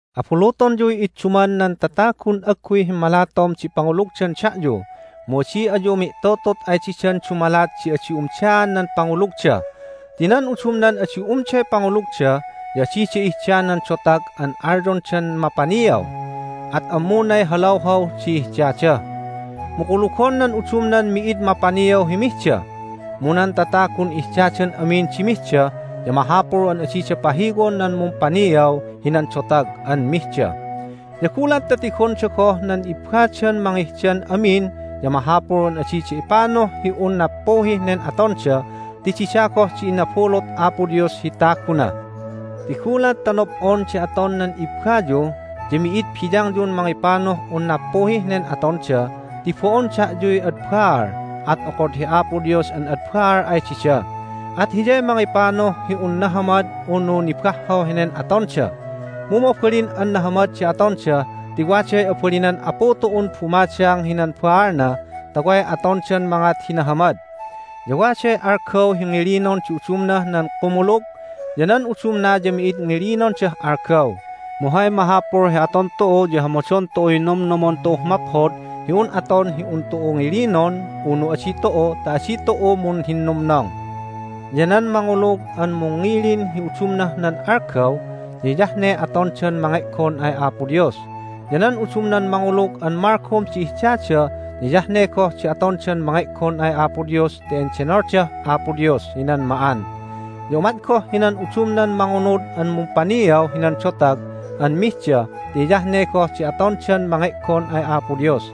Abulutonyuy idduman nan tatagun agguy himmalatom di pangulugdan da'yu, mu adi ayu mi'tutut ay didan dumalat di adi umdaan nan pangulugda. Ti nan udumnan adi umday pangulugda ya adida ihda nan dotag an alyondan mapaniaw, at ammunay halawhaw di ihdada. Mu kulugon nan udumnan mi'id mapaniaw hi mihda. Mu nan tatagun ihdadan amin di mihda ya mahapul an adida pahiwon nan mumpaniaw hinan dotag an mihda, ya gulat ta tigonda goh nan ibbadan mangihdan amin ya mahapul an adida ipanuh hi un nappuhih nen atonda ti dida goh di inabulut Apo Dios hi taguna. Ti gulat ta nob'on di aton nan ibbayu ya mi'id biyangyun mangipanuh un nappuhih nen atonda ti bo'on da'yuy ad baal. At okod hi Apo Dios an ad baal ay dida, at Hiyay mangipanuh hi un nahamad unu nibahhaw henen atonda. Mu mabalin an nahamad di atonda ti waday abalinan Apu tu'un bumadang hinan baalna ta way atondan mangat hi nahamad. Ya waday algaw hi ngilinon di udumnah nan kumulug, ya nan udumna ya mi'id ngilinondah algaw. Mu hay mahapul hi aton tu'u ya hamadon tu'uy nomnomon tu'uh maphod hi aton hi un tu'u ngilinon unu adi tu'u ta adi tu'u munhinnumnong. Ya nan mangulug an mungngilin hi udumnah nan algaw ya hiyah ne atondan mange'gon ay Apo Dios. Ya nan udumnan mangulug an malgom di ihdada ya hiyah ne goh di atondan mange'gon ay Apo Dios ti endenoldah Apo Dios hinan ma'an. Ya umat goh hinan udumnan mangunud an mumpaniaw hinan dotag an mihda ti hiyah ne goh di atondan mange'gon ay Apo Dios,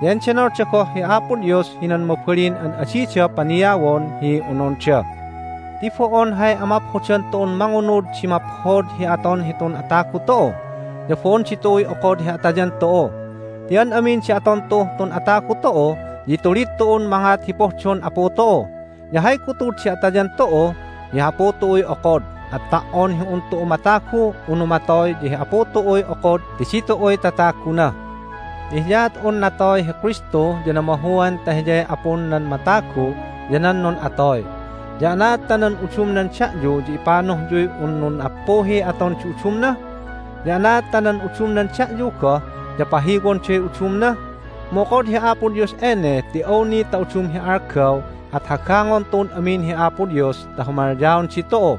ya endenolda goh hi Apo Dios hinan mabalin an adida paniawon hi ononda. Ti bo'on hay amaphodan tu'un mangunud di maphod hi aton hitun atagu tu'u, ya bo'on ditu'uy okod hi atayan tu'u. Ti an amin di aton tu'uh tun atagu tu'u ya itulid tu'un mangat hi pohdon Apu tu'u. Ya hay gutud di atayan tu'u ya hi Apu tu'uy okod. At ta"on hi un tu'u matagu unu matoy ya hi Apu tu'uy okod ti ditu'uy tataguna. Ya hiyaat un natoy hi Kristu ya namahuan ta Hiyay Apun nan matagu ya nan nun'atoy. Ya anaad ta nan udumnan da'yu ya ipanuhyuy un nun'appuhiy aton di udumna? Ya anaad ta nan udumnan da'yu goh ya pahiwonday udumna? Mu okod hi Apo Dios ene ti awni ta udum hi algaw at hagangon tu'un amin hi Apo Dios ta humalyaon ditu'u.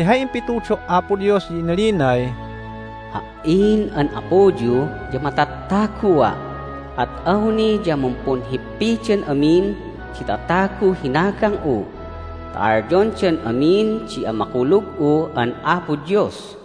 Ti hay impitudo' Apo Dios ya inalinay, "Ha"in an Apuyu ya matattagua', at awni ya mumpunhippidan amin di tataguh hinagang'u ta alyondan amin di amakulug'u an Apo Dios."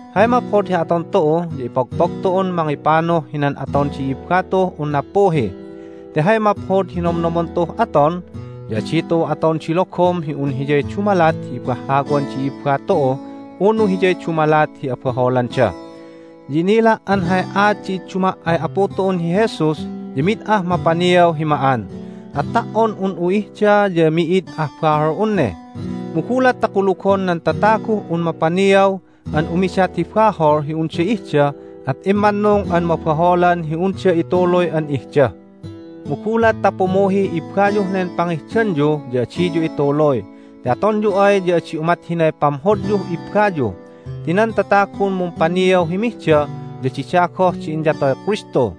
Hay maphod hi aton tu'u ya ipogpog tu'un mangipanuh hinan aton di i'ibba tu'uh un nappuhi. Ti hay maphod hi nomnomon tu'uh aton, ya adi tu'u aton di logom hi un hiyay dumalat hi ibahhawan di i'ibba tu'u unu hiyay dumalat hi abaholanda. Ya inila' an hay aat di idduma' ay Apu tu'un hi Jesus ya mid ah mapaniaw hi ma'an, at ta"on un'u ihda ya mi'id ah bahol'un ne. Mu gulat ta kulugon nan tataguh un mapaniaw an umidat hi bahol hi unda ihda at immannung an mabaholan hi unda ituluy an ihda. Mu gulat ta pumuhih ibbayuh nen pangihdanyu ya adiyu ituluy, ti atonyu ay ya adi umat hinay pamhodyuh ibbayu. Ti nan tatagun mumpaniaw hi mihda ya dida goh di inyatoy Kristu,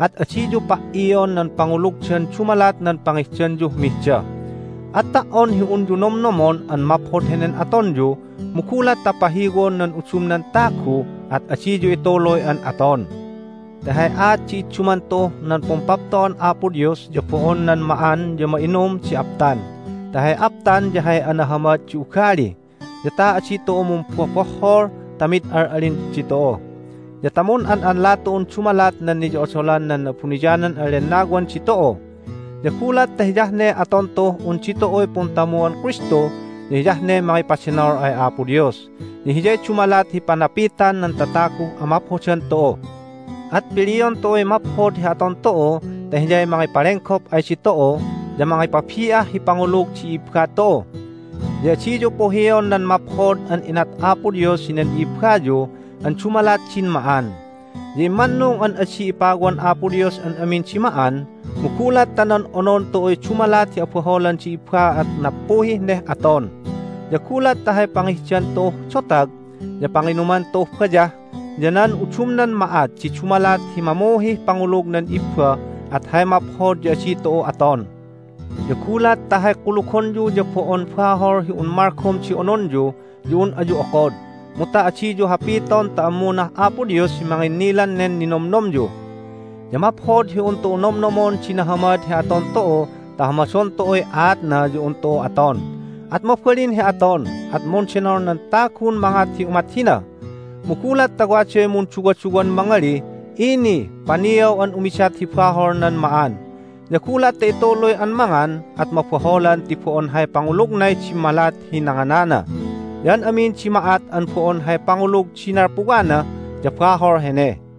at adiyu pa"ion nan pangulugdan dumalat nan pangihdanyuh mihda! At ta"on hi unyu nomnomon an maphod henen atonyu mu gulat ta pahiwon nan udumnan tagu at adiyu ituluy an aton. Ti hay aat di idduman tu'uh nan Pumpapto'an Apo Dios ya bo'on nan ma'an ya ma'inum di aptan, ti hay aptan ya hay anahamad di ugali, ya ta adi tu'u mumbobohhol ta mid al'alin ditu'u, ya ta mun'an'anla tu'un dumalat nan niyo'odolan nan Na'abuniyanan an Lennawan ditu'u. Ya gulat ta hiyah ne aton tu'uh un ditu'uy puntamuon Kristu ya hiyah ne mangipadenol ay Apo Dios, ya hiyay dumalat hi panapitan nan tataguh amaphodan tu'u. At pilion tu'uy maphod hi aton tu'u ta hiyay mangipalenggop ay ditu'u ya mangipabi'ah hi pangulug di i'ibba tu'u. Ya adiyu puhion nan maphod an inat Apo Dios hinan i'ibbayu an dumalat din ma'an. Ya immannung an adi ipawan Apo Dios an amin di ma'an. Mu gulat ta nan onon tu'uy dumalat hi abaholan di i'ibba at nappuhih neh aton. Ya gulat ta hay pangihdan tu'uh dotag, ya panginuman tu'uh bayah, ya nan udumnan ma'at di dumalat hi mamuhih pangulug nan i'ibba at hay maphod ya adi tu'u aton. Ya gulat ta hay kulugonyu ya bo'on bahol hi un malgom di ononyu ya un ayu okod, mu ta adiyu hapiton ta ammunah Apo Dios hi manginnilan nen ninomnomyu. Ya maphod hi un tu'u nomnomon di nahamad hi aton tu'u ta hamadon tu'uy aatna ya un tu'u aton, at mabalin hi aton, at mundenol nan tagun mangat hi umat hina! Mu gulat ta waday munduwaduwan mangalih, "Ini! Paniaw an umidat hi bahol nan ma'an!" Ya gulat ta ituluy an mangan at mabaholan ti bo'on hay pangulugnay dimmalat hi nanganana. Ya an amin di ma'at an bo'on hay pangulug di nalpuwana ya bahol hene.